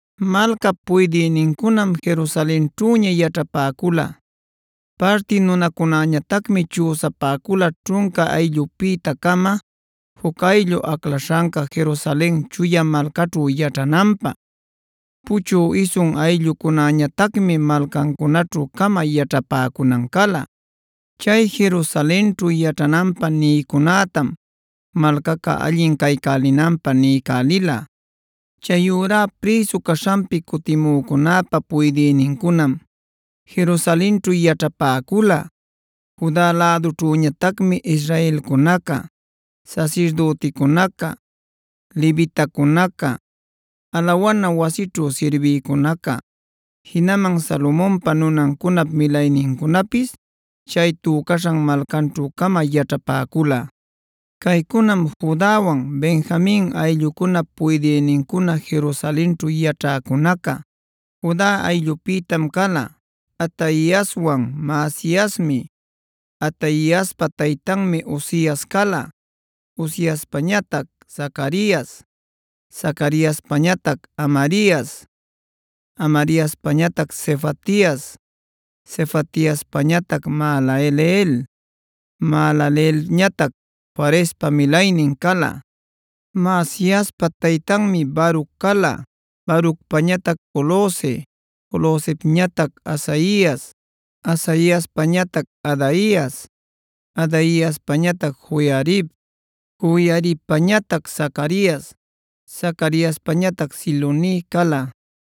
Malcap puydïnincunam Jerusalenćhüña yaćhapäcula. Parti nunacunäñatacmi chüsapäcula ćhunca ayllupïta-cama juc ayllu aclaśhanca Jerusalen chuya malcaćhu yaćhananpä; puchü isun ayllucunäñatacmi malcancunaćhu-cama yaćhapäcunan cala. Chay Jerusalenćhu yaćhananpä nïcunätam malcaca allin caycälinanpä niycälila. Chayurá prïsu caśhanpi cutimücunäpa puydïnincunam Jerusalenćhu yaćhapäcula. Juda lädućhüñatacmi israelcunaca, sasirdüticunaca, levitacunaca, alawana wasićhu sirbïcunaca, jinaman Salomonpa nunancunap milaynincunapis chay tücaśhan malcanćhu-cama yaćhapäcula. Caycunam Judawan, Benjamin ayllucunap puydïnincuna Jerusalenćhu yaćhäcunaca. Juda ayllupïtam cala:a Ataiaswan Maasaiasmi. Ataiaspa taytanmi Uzias cala. Uziaspañatac Zacarias, Zacariaspañatac Amarias, Amariaspañatac Sefatias, Sefatiaspañatac Mahalaleel, Mahalaleelñatac Farespa milaynin cala. Maasiaspa taytanmi Baruc cala; Barucpañatac Colhoze, Colhozepñatac Hazaias, Hazaiaspañatac Adaias, Adaiaspañatac Joiarib, Joiaribpañatac Zacarias, Zacariaspañatac Siloni cala.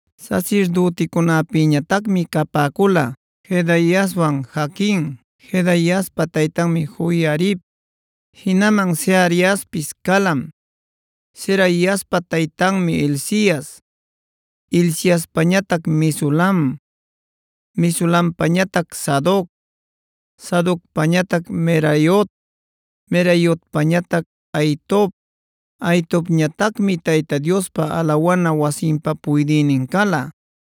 Sasirdüticunäpïñatacmi capäcula: Jedaiaswan Jaquin; Jedaiaspa taytanmi Joiarib. Jinaman Seraiaspis calam; Seraiaspa taytanmi Hilcias; Hilciaspañatac Mesulam, Mesulampañatac Sadoc, Sadocpañatac Meraiot, Meraiotpañatac Ahitob; Ahitobñatacmi Tayta Diospa alawa wasinpa puydïnin cala.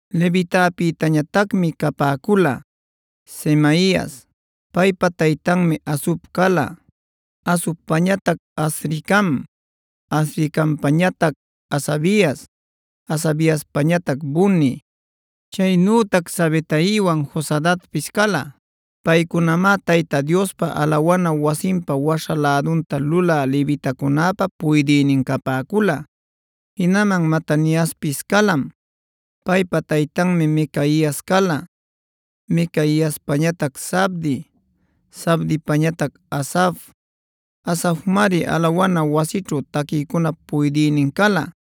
Levitapïtañatacmi capäcula: Semaias; paypa taytanmi Hasub cala; Hasubpañatac Azricam, Azricampañatac Hasabias, Hasabiaspañatac Buni. Chaynütac Sabetaiwan Jozabadpis cala. Paycunamá Tayta Diospa alawana wasinpa waśha lädunta lulä levitacunäpa puydïnin capäcula. Jinaman Mataniaspis calam. Paypa taytanmi Micaias cala, Micaiaspañatac Zabdi, Zabdipañatac Asaf. Asafmari alawana wasićhu taquïcunap puydïnin cala,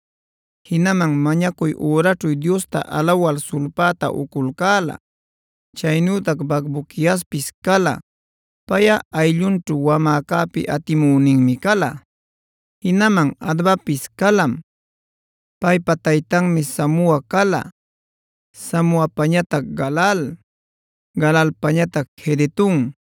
jinaman mañacuy üraćhu Diosta alawal sulpäta uculcäla. Chaynütac Bacbuquiaspis cala; payꞌa ayllunćhu wamäcäpi atimüninmi cala. Jinaman Abdapis calam; paypa taytanmi Samua cala, Samuapañatac Galal, Galalpañatac Jedutun.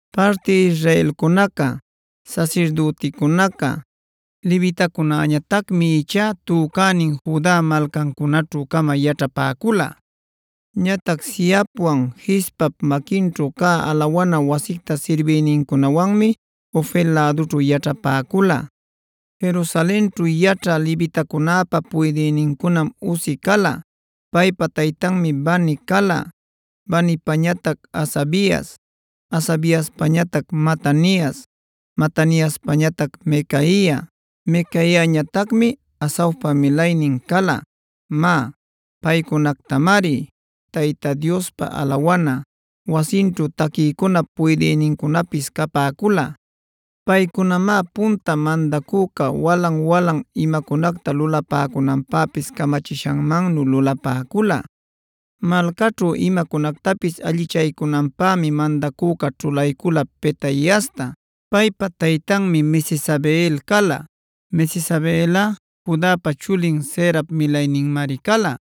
Parti israelcunaca, sasirdüticunaca, levitacunäñatacmi ichá tücänin Juda malcancunaćhu-cama yaćhapäcula. Ñatac Zihapwan Gispap maquinćhu cä alawana wasicta sirbïnincunawanmi Ofelb lädućhu yaćhapäcula. Jerusalenćhu yaćhä levitacunäpa puydïnincunam Uzi cala; paypa taytanmi Bani cala, Banipañatac Hasabias, Hasabiaspañatac Matanias, Mataniaspañatac Micaia; Micaiañatacmi Asafpa milaynin cala. Má, paycunatacmari Tayta Diospa alawana wasinćhu taquïcunap puydïnincunapis capäcula. Paycunamá punta mandacüca walan-walan imacunacta lulapäcunanpäpis camachishanmannu lulapäcula. Malcaćhu imacunactapis allichaycunanpämi mandacüca ćhulaycula Petaiasta; paypa taytanmi Mesezabeel cala. Mesezabeelꞌa Judapa chulin Zerap milayninmari cala.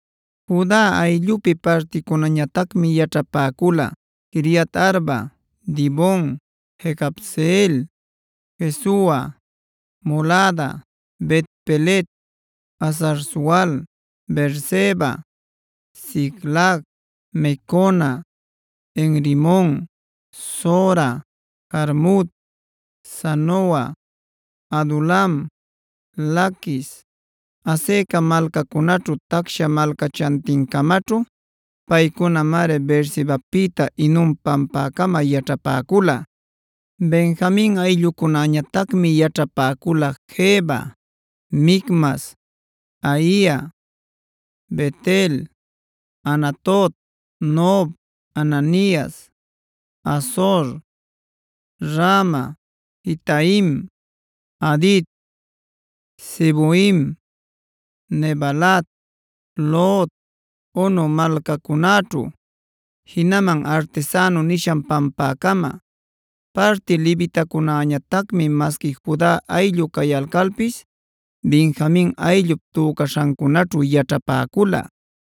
Juda ayllupi particunäñatacmi yaćhapäcula Quiriat-arba, Dibon, Jecabseel, Jesua, Molada, Bet-pelet, Hazar-sual, Beerseba, Siclag, Mecona, En-rimon, Zora, Jarmut, Zanoa, Adulam, Laquis, Azeca malcacunäćhu tacsha malcachantincamaćhu. Paycunamari Beersebapïta Hinom pampäcama yaćhapäcula. Benjamin ayllucunäñatacmi yaćhapäcula Geba, Micmas, Aia, Bet-el, Anatot, Nob, Ananias, Hazor, Rama, Gitaim, Hadid, Seboim, Nebalat, Lod, Ono malcacunaćhu, jinaman Artesano nishan pampäcama. Parti Levicunäñatacmi masqui Juda ayllu cayalcalpis Benjamin ayllup tücaśhancunaćhu yaćhapäcula.